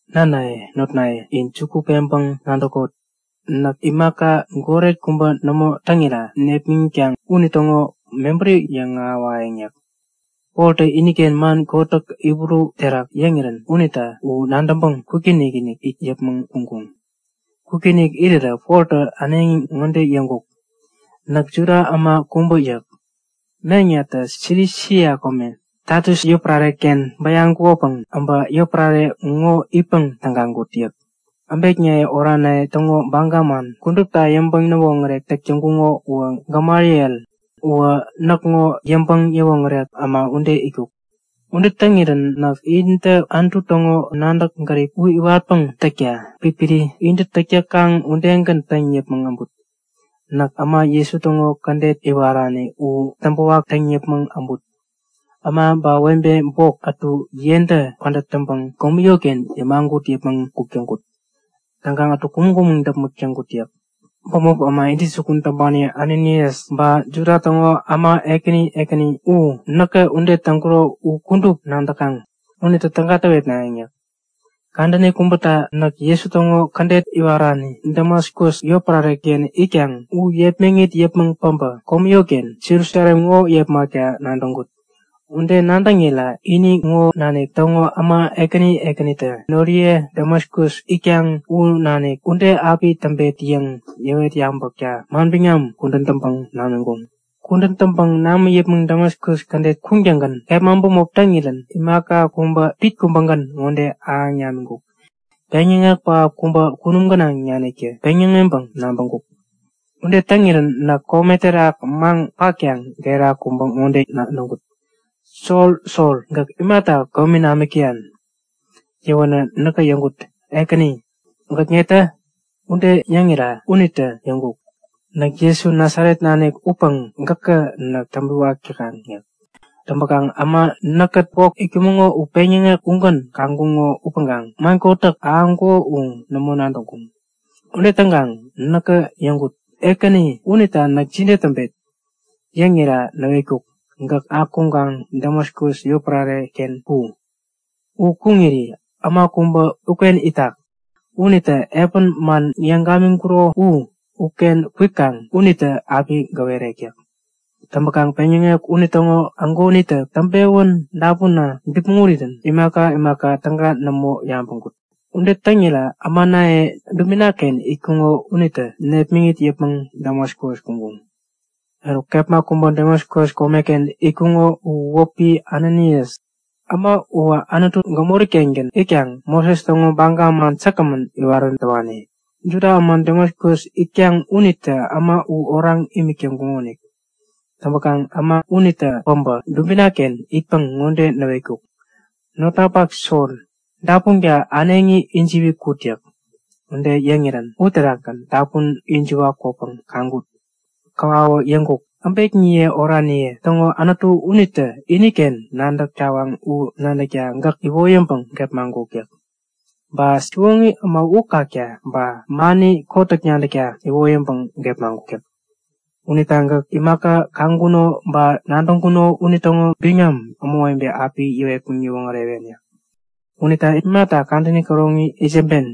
Nanaye, notnaye, in juku peŋpäŋ nadäkot! Näk imaka goret kubä nämo täŋira nepmäŋitkaŋ unitäŋo mebäri yäŋ ahäwayäŋ yäk. Poltä iniken man kotäk Hibru uterak yäŋirän unita u nadäŋpäŋ kwikinik-inik it yäpmäŋ kuŋkuŋ. Kwikinik irirä Poltä äneŋi ŋode yäŋkuk; Näk Juda äma kubä yäk. Meŋnatä Silisia kome, Tasus yotpärare-ken bäyaŋkukopäŋ äbä yotpärare ŋo itpäŋ tägaŋkut yäk. Äbekniye oraniye täŋo baga man kudupta yäŋpäŋ-näwoŋärek täk täŋkuko uwä Gamaliel. Uwä näkŋo yäŋpäŋ-näwoŋärek äma ude yäk. Ude täŋirän näk intä Anutu täŋo nadäk-gärip u iwatpäŋ täkta pipiri intä täk täkaŋ udegän täŋ yäpmäŋ äbut. Näk äma Jesu täŋo Kädet iwarani u täŋpäwak täŋ yäpmäŋ äbut. Äma ba webe bok ätu yentä pädät täŋpäŋ komi yotken yämagut yäpmäŋ kuk täŋkut. Täŋkaŋ ätu kumäŋ-kumäŋ däpmäk täŋkut yäk. Bämop äma intäjukun täŋpani Ananias, ba Juda täŋo äma ekäni ekäni u näkä ude täŋkuro u kudup nadäkaŋ. Unitä täga täwetnayäŋ yäk. Kadäni kubäta näk Jesu täŋo Kädet iwarani Damaskus yotpärare-ken itkaŋ u yepmäŋit yäpmäŋ päbä komi yotken Jerusalem ŋo yepmakta nadäŋkut. Ude nadäŋira ini ŋo nanik täŋo äma ekäni ekänitä noriye Damaskus itkaŋ u Näk ude api täŋpet yäŋ yäwet yabäkta manbiŋam kudän täŋpäŋ namiŋkuŋ. Kudän täŋpäŋ namä yäpmäŋ Damaskus kädet kuŋtäŋgän kepma bämopi taŋirän imaka kubä pit kubägän ŋode ahäŋ namiŋkuk; Peŋyäŋek pähap kubä kunum gänaŋ naniktä peŋyäŋeŋpäŋ nabäŋkuk. Ude täŋirän näk kome terak maŋ patkaŋ gera kubä ŋode nadäŋkut; Sol! Sol! Gäk imata komi namik täyan? Yäwänä näkä yäŋkut; Ekäni, gäk netä? Ude yäŋira unitä yäŋkuk; Näk Jesu Nasaret nanik upäŋ gäkä näk täŋpiwak täkaŋ yäk. Täŋpäkaŋ äma näkkät bok itkumäŋo u peŋyäŋek ugän kaŋkuŋo upäŋkaŋ man kotäk ahäŋkuko u nämo nadäŋkuŋ. Ude täŋkaŋ näkä yäŋkut; Ekäni, unita näk jide täŋpet? Yäŋira näwetkuk; Gäk akuŋkaŋ Damaskus yotpärare-ken ku! U kuŋiri äma kubä uken itak. Unita epän man yäŋ gamiŋkuro u, uken kwikaŋ unitä api gäwerek yäk. Täŋpäkaŋ peŋyäŋek unitäŋo ägonitä täŋpewän dapuna bipmäŋ urirän imaka imaka täga nämo yabäŋkut. Ude täŋira ämanaye dubina-ken itkuŋo unitä nepmäŋit yäpmäŋ Damaskus kuŋkuŋ. Eruk, äma kubä Damaskus komeken itkuko u wäpi Ananias. Äma uwä Anutu gämori-kengän itkaŋ Moses täŋo baga man säkgämän iwarän täwani. Juda äma Damaskus itkaŋ unitä äma u oraŋ imik täŋkuŋonik. Täŋpäkaŋ äma unitä päbä dubina-ken itpäŋ ŋode näwetkuk; Notnapak Sol, dapunka äneŋi ijiwi kut yäk. Ude yäŋirän uterakgän dapun ijiwa kwäpäŋ kaŋkut. Käwawä yäŋkuk; Äbekniye oraniye täŋo Anutu unitä iniken nadäk tawaŋ u nadäkta gäk iwoyäŋpäŋ gepmaŋkuk yäk. Ba Siwoŋi Äma u kakta ba mani kotäk nadäkta iwoyäŋpäŋ gepmaŋkuk yäk. Unita gäk imaka kaŋkuno ba nadäŋkuno unitäŋo biŋam ämawebe api yäwetpäŋ yäwoŋärewen yäk. Unita imata kadäni käroŋi itsämben?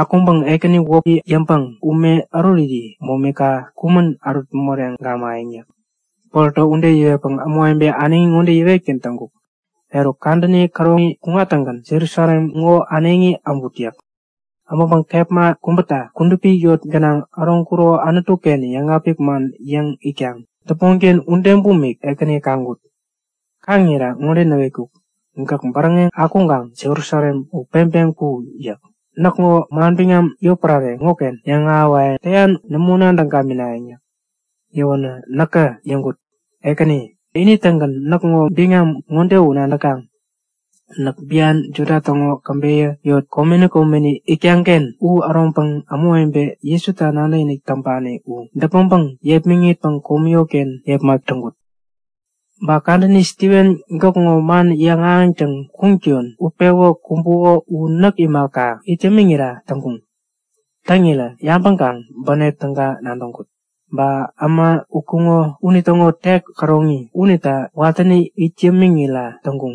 Akuŋpäŋ Ekäni wäpi yäŋpäŋ ume äruriri momika kumän ärut moreŋ gamayäŋ yäk. Poltä ude yäwetpäŋ ämawebe äneŋi ŋode yäwetgän täŋkuk; Eruk, kadäni käroŋi kuŋattäŋgän Jerusalem ŋo äneŋi äbut yäk. Äbäŋpäŋ kepma kubäta kudupi yot gänaŋ äroŋkuro Anutu-ken yäŋapik man yäŋ itkaŋ däpmonken ude bumik Ekäni kaŋkut. Kaŋira ŋode näwetkuk; Gäk bäräŋeŋ akuŋkaŋ Jerusalem u peŋpeŋ ku! yäk. Näkŋo manbiŋam yotpärare ŋoken yäŋahäwayäŋ täyan u nämo nadäŋ gaminayäŋ yäk. Yäwänä näkä yäŋkut; Ekäni, ini-tägän näkŋo biŋam ŋode u nadäkaŋ; Näk bian Juda täŋo käbeyä yot komeni komeni itkaŋ-ken u äroŋpäŋ ämawebe Jesuta nadäkinik täŋpani u däpmäŋpäŋ yepmäŋitpäŋ komi yotken yepmak täŋkut. Ba kadäni Stiven gäkŋo man yäŋahäŋtäŋ kuŋattäyon utpewä kumbuko u näk imaka, it yämiŋira täŋkuŋ. Täŋirä yabäŋkaŋ bänep täga nadäŋkut. Ba äma utkuŋo unitäŋo tek käroŋi unita watäni it yämiŋira täŋkuŋ.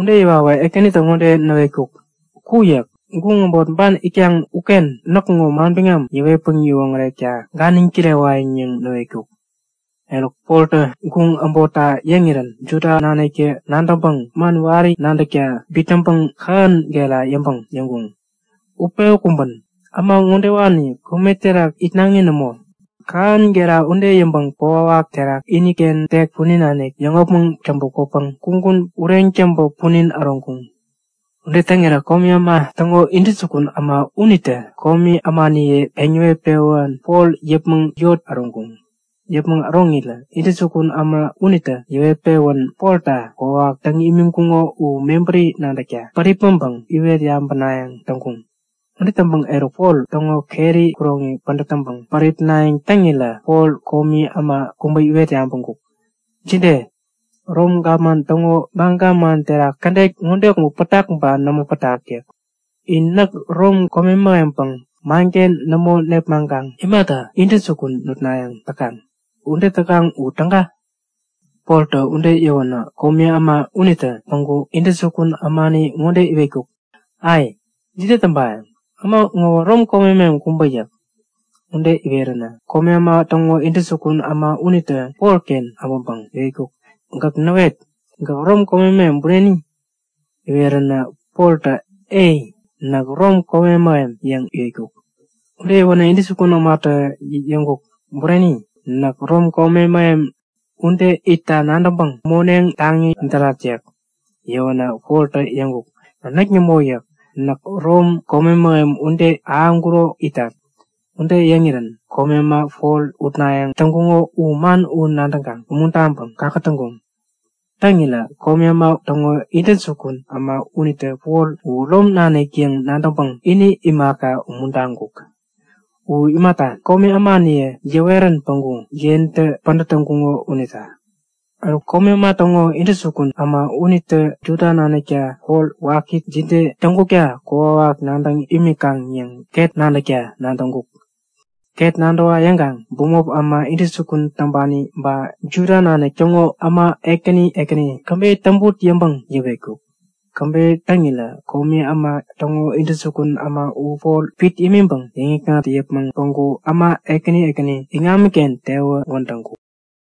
Ude yäwawä Ekänitä ŋode näwetkuk; Ku! yäk. Guŋ äbot ban itkaŋ uken näkŋo manbiŋam yäwetpäŋ yäwoŋärekta ganiŋ kirewayäŋ yäŋ näwetkuk. Eruk, Poltä guŋ äbotta yäŋirän Juda naniktä nadäŋpäŋ man wari nadäkta bitnäŋpäŋ kähän gera yäŋpäŋ yäŋkuŋ; Utpewä kumbän! Äma ŋodewani kome terak itnaŋi nämo! Kähän gera ude yäŋpäŋ kokwawak terak iniken tek punin nanik yäŋopmäŋ täŋpä kwäpäŋ kugun poriŋpäŋ ureŋ täŋpä punin äroŋkuŋ. Ude täŋirä komi äma täŋo intäjukun äma unitä komi ämaniye peŋ yäwet-pewän Pol yäpmäŋ yot gänaŋ äroŋkuŋ. Yäpmäŋ äroŋirä intäjukun äma unitä yäwet-pewän Polta kokwawak täŋ imiŋkuŋo u mebäri nadäkta päripmäŋpäŋ iwet yabänayäŋ täŋkuŋ. Ude täŋpäŋ eruk Pol täŋo keri kuroŋi pädät täŋpäŋ päripnayäŋ täŋirä Pol komi äma kubä iwet yabäŋkuk; Jide? Rom gapman täŋo baga man terak kädet ŋode kubä pätak ba nämo pätak? yäk. In näk, Rom kome mähempäŋ, manken nämo nepmaŋkaŋ imata intäjukun nutnayäŋ täkaŋ? Ude täkaŋ u täga? Poltä ude yäwänä komi äma unitä päŋku intäjukun ämani ŋode iwetkuk; Ai, jide täŋpayäŋ? Äma ŋowä Rom kome mähem kubä yäk. Ude iweränä komi äma täŋo intäjukun äma unitä Polken äbäŋpäŋ iwetkuk; Gäk näwet! Gäk Rom kome mähem bureni? Iweränä Poltä Ei, näk Rom kome mähem yäŋ iwetkuk. Ude iweränä intäjukun ämatä yäŋkuk; Bureni? Näk Rom kome mähem ude itta nadäŋpäŋ moneŋ taŋi därat yäk. Yäwänä Poltä yäŋkuk; Näk nämo yäk. Näk Rom kome mähem ude ahäŋkuro itat. Ude yäŋirän komi äma Pol utnayäŋ täŋkuŋo u man u nadäŋkaŋ umuntaŋpäŋ kakätäŋkuŋ. Täŋirä komi äma täŋo intäjukun äma unitä Pol u Rom nanik yäŋ nadäŋpäŋ, ini imaka, umuntaŋkuk. U imata, komi ämaniye yäwerän päŋku yentä pädät täŋkuŋo unita. Eruk komi äma täŋo intäjukun äma unitä Juda naniktä Pol waki jide täŋkukta kokwawak nadäŋ imikaŋ yäŋ ket nadäkta nadäŋkuk. Ket nadäwa yäŋkaŋ bämop äma intäjukun täŋpani ba Juda nanik täŋo äma ekäni ekäni käbeyä täŋput yäŋpäŋ yäwetkuk. Käbeyä täŋirä komi äma täŋo intäjukun äma u Pol pit imiŋpäŋ yäŋikŋat yäpmäŋ päŋku äma ekäni ekäni iŋamiken tewän wädäŋkuk.